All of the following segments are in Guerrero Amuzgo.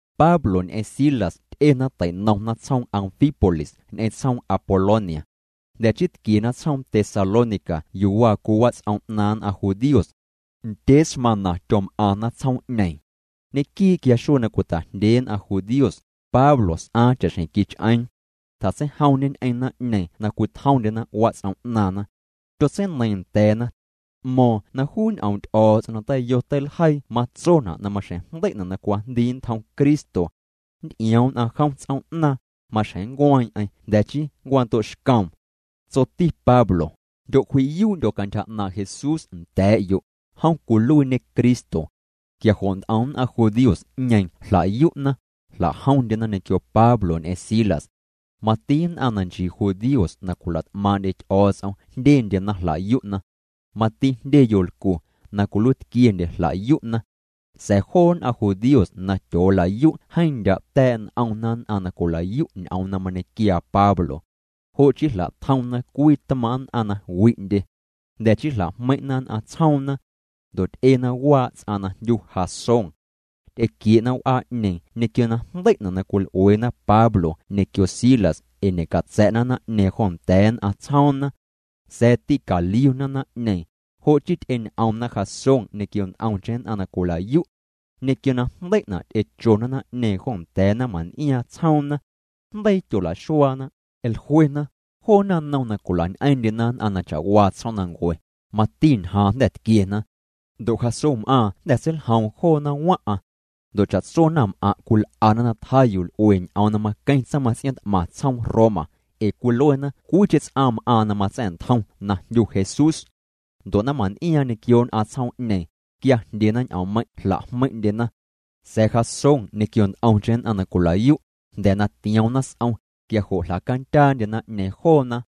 Pablo ñ'eⁿ Silas ty'ena tei'nomna tsjoom Anfípolis ñ'eⁿ tsjoom Apolonia. Jnda̱ chii tquiena tsjoom Tesalónica yuu waa cwii wats'om 'naaⁿ nn'aⁿ judíos. Ndyee smaⁿna tyom'aⁿna tsjoom'ñeeⁿ. Ñequii' quia xuee na cwita'jndyee nn'aⁿ judíos, Pablo s'aaⁿ cha'xjeⁿ quich'eeⁿ. Tjatseijomñê ñ'eⁿ naⁿ'ñeeⁿ na cwitjomndyena wats'om 'naaⁿna. Tyotseineiiⁿ nda̱a̱na. T'mo̱o̱ⁿ na juu ñ'oom' Ty'o̱o̱ts'om na teiyo teiljeii matsona' na maxjeⁿ jndei'na' na cwajndii nntjom Cristo. Nnty'ioom nn'aⁿ jom ts'oom'naaⁿ, maxjeⁿ nncueeⁿ'eⁿ jnda̱ chii nncwando'xcoom. Tsoti Pablo: —Jndyocwji'yuu'ndyo̱ cantyja 'naaⁿ' Jesús nda̱a̱'yo', jom cwiluiiñê Cristo. Quia jo' nt'om nn'aⁿ judíos'ñeeⁿ jla'yu'na, jla'jomndyena ñequio Pablo ñ'eⁿ Silas. Mati nn'aⁿ na nchii judíos na cwila't'maaⁿ'ndye Ty'o̱o̱ts'om jndyendyena jla'yu'na. Mati jndye yolcu na cwiluiitquiendye jla'yu'na. Sa̱a̱ joo nn'aⁿ judíos na tyoola'yu' jeeⁿ ndya' ta̱a̱' n'omna nn'aⁿ na cwila'yu' ñ'oom na mañequiaa Pablo. Jo' chii jla'tjomna cwii tmaaⁿ' nn'aⁿ na wi'ndye. Jnda̱ chii jla'jmeiⁿ'na nn'aⁿ tsjoomna. Ndo' ty'ena waa' ts'aⁿ na jndyu Jasón. Ty'equie'na w'aa'ñeeⁿ ñequio na jndei'na' na cwil'ueena Pablo ñequio Silas ee ñe'catsa̱'na naⁿ'ñeeⁿ jo nda̱a̱ nn'aⁿ tsjoomna. Sa̱a̱ tîcaliuna naⁿ'ñeeⁿ, jo' chii ty'eñ'omna Jasón ñequio nt'omcheⁿ nn'aⁿ na cwila'yu'. Ñequio na jndei'na' ty'echona naⁿ'ñeeⁿ jo nda̱a̱ naⁿmaⁿn'iaaⁿ tsjoomna. Jndeii tyolaxuaana, jluena: —Joo naⁿnom na cwila'ñ'eeⁿ'ndyena nn'aⁿ na cha'waa tsjoomnancue, mati ñjaaⁿ jnda̱ tquiena. Ndo' Jasónm'aaⁿ jnda̱ seiljoom joona waⁿ'aⁿ. Ndo' cha'tso naⁿm'aⁿ' cwil'ana na tjaa yuu l'ue ñ'oom na maqueⁿ tsaⁿmaⁿts'iaaⁿ t'maⁿ tsjoom Roma, ee cwiluena cwiicheⁿ ts'aⁿ m'aaⁿ na matsa̱'ntjom na jndyu Jesús. Ndo' naⁿmaⁿn'iaaⁿ ñequio nn'aⁿ tsjoom'ñeeⁿ, quia jndyena ñ'oommeiⁿ' jla'jmeiⁿ'ndyena. Sa̱a̱ Jasón ñequio nt'omcheⁿ nn'aⁿ na cwila'yu', jnda̱ na tioomna s'om, quia jo' jla'candyaandye naⁿ'ñeeⁿ joona.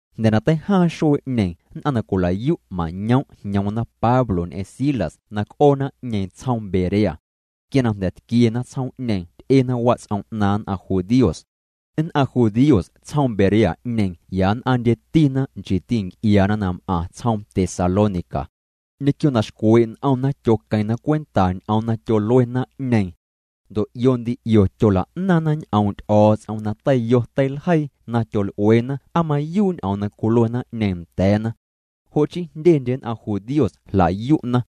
Jnda̱ na teijaaⁿ xuee'ñeeⁿ nn'aⁿ na cwila'yu' mañoom' jñoomna Pablo ñ'eⁿ Silas na c'oo naⁿ'ñeeⁿ tsjoom Berea. Quia na jnda̱ tquiena tsjoom'ñeeⁿ ty'ena wats'om 'naaⁿ nn'aⁿ judíos. Nn'aⁿ judíos tsjoom Berea'ñeeⁿ ya nn'aⁿndyetina nchiiti nc'iaana na m'aⁿ tsjoom Tesalónica. Ñequio na xcwee' n'omna tyoqueⁿna cwenta ñ'oom na tyolue naⁿ'ñeeⁿ. Ndo' 'io ndi 'io tyola'naaⁿna ñ'oom' Ty'o̱o̱ts'om na teiyo teiljeii na tyol'ueena aa mayuu' ñ'oom na cwilue naⁿ'ñeeⁿ nda̱a̱na. Jo' chii jndyendye nn'aⁿ judíos jla'yu'na.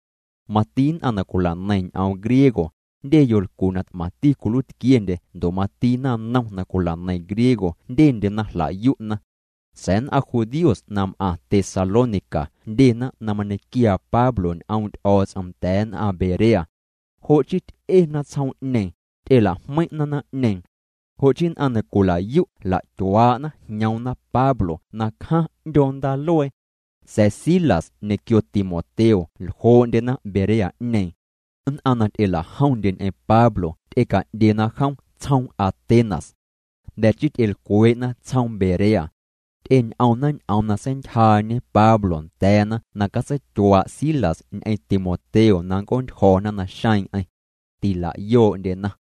Mati nn'aⁿ na cwilaneiⁿ ñ'oom griego, jndye yolcu na t'maⁿti cwiluiitquiendye ndo' mati naⁿnom na cwilaneiⁿ griego jndyendyena jla'yu'na. Sa̱a̱ nn'aⁿ judíos na m'aⁿ Tesalónica jndyena na mañequiaa Pablo ñ'oom' Ty'o̱o̱ts'om nda̱a̱ nn'aⁿ Berea. Jo' chii ty'ena tsjoom'ñeeⁿ, ty'ela'jmeiⁿ'na naⁿ'ñeeⁿ. Jo' chii nn'aⁿ na cwila'yu' jla'tyuaa'na jñoomna Pablo na cjaⁿ 'ndyoo ndaaluee. Sa̱a̱ Silas ñequio Timoteo ljoo'ndyena Berea'ñeeⁿ. Nn'aⁿ na ty'ela'jomndye ñ'eⁿ Pablo ty'eca'ndyena jom tsjoom Atenas. Jnda̱ chii ty'elcwee'na tsjoomna Berea. Ty'eñ'omna ñ'oom na seintyjaañe Pablo nda̱a̱na na catseityuaa' Silas ñ'eⁿ Timoteo na nnc'oontyjo̱na naxeeⁿ'eⁿ. Tila'yoo'ndyena.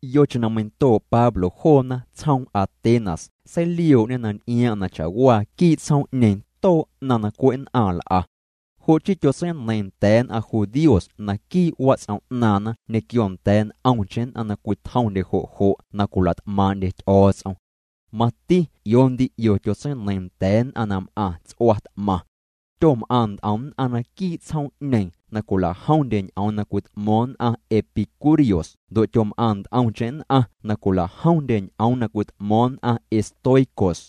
Yocheⁿ na meindoo' Pablo joona tsjoom Atenas seilioo'ñê na nty'iaaⁿ'aⁿ na cha'waa quii' tsjoom'ñeeⁿ too' 'naⁿ na cwe' nn'aⁿ l'a. Jo' chii tyotseineiiⁿ nda̱a̱ nn'aⁿ judíos naquii' wats'om 'naaⁿna ñequio nda̱a̱ nt'omcheⁿ nn'aⁿ na cwitjomndye jo' jo' na cwila't'maaⁿ'ndye Ty'o̱o̱ts'om. Mati 'io ndi 'io tyotseineiiⁿ nda̱a̱ nn'aⁿ na m'aⁿ ts'ua t'maⁿ. Tyom'aⁿ nt'om nn'aⁿ naquii' tsjoom'ñeeⁿ na cwila'jomndye ñ'oom na cwit'mo̱o̱ⁿ nn'aⁿ epicúreos ndo' tyom'aⁿ nt'omcheⁿ nn'aⁿ na cwilajomndye ñ'oom na cwit'mo̱o̱ⁿ nn'aⁿ estoicos.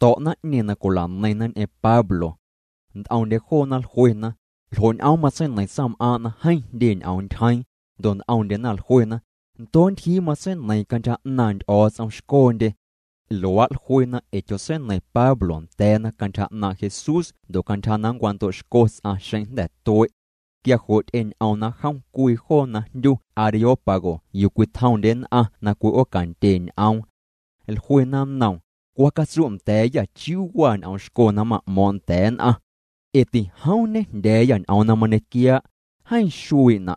To̱' naⁿ'ñeeⁿ na cwila'neiⁿna ñ'eⁿ Pablo. Nt'omndye joona jluena: —¿Ljo' ñ'oom matseineiⁿ tsaⁿm'aaⁿ' na jeeⁿ jndye ñ'oom ntyjeeⁿ? Ndo' nt'omndyena jluena: —Ndoo' ntyjii matseineiiⁿ cantyja 'naaⁿ nty'o̱o̱ts'om xcondye. Luaa' jluena ee tyotseineiⁿ Pablo nda̱a̱na cantyja 'naaⁿ' Jesús ndo' cantyja na nncwando'xco ts'aⁿ xeⁿ jnda̱ tue'. Quia jo' ty'eñ'omna jom cwii joo na jndyu Areópago yuu cwitjomndye nn'aⁿ na cwi'oocandye ñ'oom. Jluena nnoom: —Cwa catsu' nda̱a̱yâ chiuu waa ñ'oom xco na ma'mo̱o̱ⁿ' nda̱a̱ nn'aⁿ. Ee tijoom ñejndya̱a̱yâ ñ'oom na mañequiaa', jeeⁿ xuii' juuna'.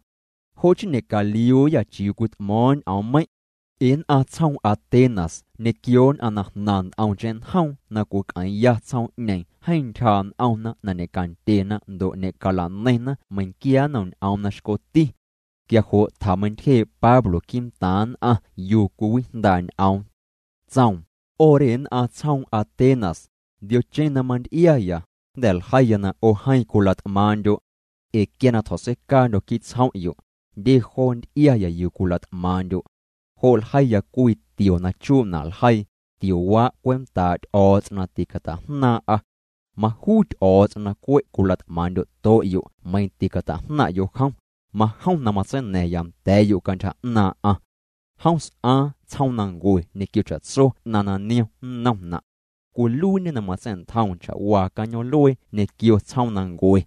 Jo' chii ñe'caliuuyâ chiuu cwit'mo̱o̱ⁿ ñ'oommeiⁿ'. Ee nn'aⁿ tsjoom Atenas ñequio nn'aⁿ na jnaⁿ nt'omcheⁿ njoom na cwic'eeⁿya tsjoom'ñeeⁿ jeeⁿ ntyjaa' n'omna na ñe'candyena ndo' ñe'cala'neiⁿna meiⁿnquia nnom ñ'oom na xcoti. Quia jo' tjameintyjee' Pablo quii'ntaaⁿ nn'aⁿ yuu cwiwijndaa' ñ'oom. Tsoom: —'O re nn'aⁿ tsjoom Atenas, ndiocheⁿ na manty'iaya, jnda̱ ljeiya na 'o jeeⁿ cwila't'maaⁿ'ndyo'. Ee quia na tjo̱tseicaandyo̱ quii' tsjom'yo', jndye joo nty'iaya yuu cwila't'maaⁿ'ndyo'. Jo' ljeiya cwii tio na chuna' ljeii: “Tiowaa' cwentaa' Ty'o̱o̱ts'om na ticata'jnaaⁿ'a.” Majuu Ty'o̱o̱ts'om na cwe' cwila't'maaⁿ'ndyo'to'yo' meiⁿ ticata'jnaaⁿ'yo' jom, majom na matseina̱ⁿya nda̱a̱'yo' cantyja 'naaⁿ'aⁿ. ’Jom s'aaⁿ tsjoomnancue ñequio cha'tso 'naⁿ na niom nnomna'. Cwiluiiñê na matsa̱'ntjoom cha'waa cañoom'luee ñequio tsjoomnancue.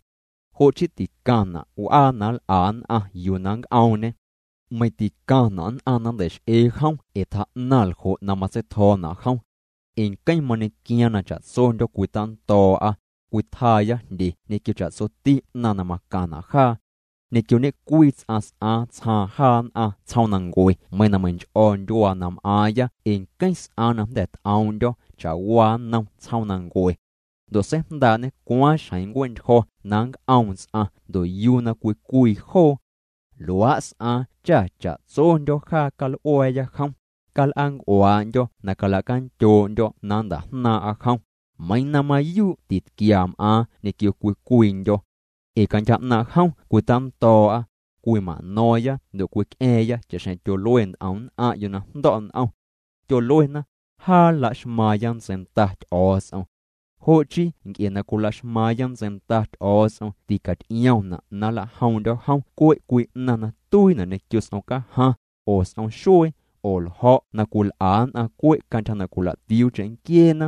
Jo' chii ticaⁿna' w'aa na nl'a nn'aⁿ yuu na nnc'oomñê. Meiⁿ ticaⁿna' nn'aⁿ na nntei'x'ee jom ee tjaa'naⁿ ljo' na matsei'tjo̱o̱na' jom. Ee nqueⁿ mañequiaaⁿ na cha'tsondyo̱ cwitando̱o̱'a, cwitjaaya jndye ñequio cha'tsoti 'naⁿ na macaⁿna' jaa. ’Ñequio ñe'cwii ts'aⁿ s'aaⁿ tsjaaⁿ jaa nn'aⁿ tsjoomnancue meiⁿ na meinch'o̱ ndyuaa na m'aaⁿya ee nqueⁿ s'aaⁿ na jnda̱ t'oom'ndyo̱ cha'waa nnom tsjoomnancue. Ndo' seijndaa'ñê cwaaⁿ xjeⁿ nncue'ntyjo̱ na nnc'oom ts'aⁿ ndo' yuu na cwii cwii joo. Luaa' s'aaⁿ cha cha'tsondyo̱ jaa cal'ua̱a̱ya jom, cal'aanc'uaa'ndyo̱ na calacandyoo'ndyo̱ na nnta'jnaaⁿ'a jom, meiiⁿ na mayuu' titquia m'aaⁿ ñequio cwii cwiindyo̱. Ee cantyja 'naaⁿ' jom cwitando̱o̱'a, cwima'no̱o̱ⁿya ndo' cwic'a̱a̱ⁿya cha'xjeⁿ tyolue nt'om nn'aⁿ'yo' na jndo̱' n'om. Tyoluena: “Jaa laxmaaⁿya ntseinda Ty'o̱o̱ts'om.” Jo' chii nc'e na cwilaxmaaⁿya ntseinda Ty'o̱o̱ts'om ticaty'iomna' na nlajoom'ndyo̱ jom cwe' cwii 'naⁿ na tuiina' ñequio s'om cajaⁿ, oo s'om xuee, oo ljo̱' na cwil'a nn'aⁿ cwe' cantyja na cwila'tiuu cheⁿnquieena.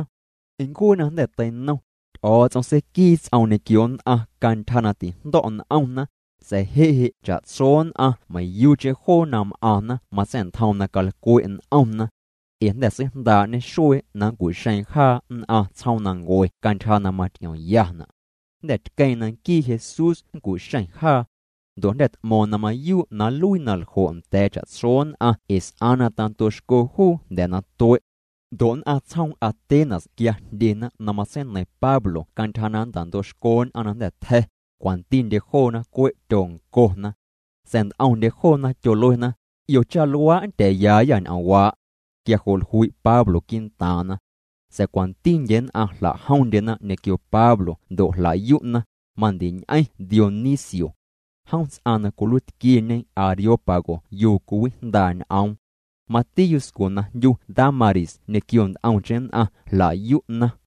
Ncuee na jnda̱ teinom, Ty'o̱o̱ts'om seiquii ts'oom ñequio nn'aⁿ cantyja na tijndo̱' n'omna, sa̱a̱ je' je' cha'tso nn'aⁿ meiⁿyuucheⁿ joo na m'aⁿna matsa̱'ntjoom na calcwe' n'omna. Ee jnda̱ seijndaa'ñê xuee na nncu'xeeⁿ jaa nn'aⁿ tsjoomnancue cantyja na maty'iomyana'. Jnda̱ tqueeⁿ na nquii Jesús nncu'xeⁿ jaa. Ndo' jnda̱ t'mo̱o̱ⁿ na mayuu' na nluii na ljo' nda̱a̱ cha'tso nn'aⁿ ee s'aaⁿ na tando'xco juu jnda̱ na tue'. Ndo' nn'aⁿ tsjoom Atenas quia jndyena na matseineiⁿ Pablo cantyja na nntando'xco nn'aⁿ na jnda̱ tja̱, cwantindye joona cwe' tyoncona. Sa̱a̱ nt'omndye joona tyoluena: —'Io cha luaa' nndya̱a̱yaayâ ñ'oomwaa'. Quia jo' jlui' Pablo quii'ntaaⁿna. Sa̱a̱ cwantindye nn'aⁿ jla'jomndyena ñequio Pablo ndo' jla'yu'na, mandiñ'eⁿ Dionisio. Jom ts'aⁿ na cwiluiitquieñe Areópago yuu cwiwijndaa' ñ'oom. Mati yuscu na jndyu Dámaris ñequio nt'omcheⁿ nn'aⁿ jla'yu'na.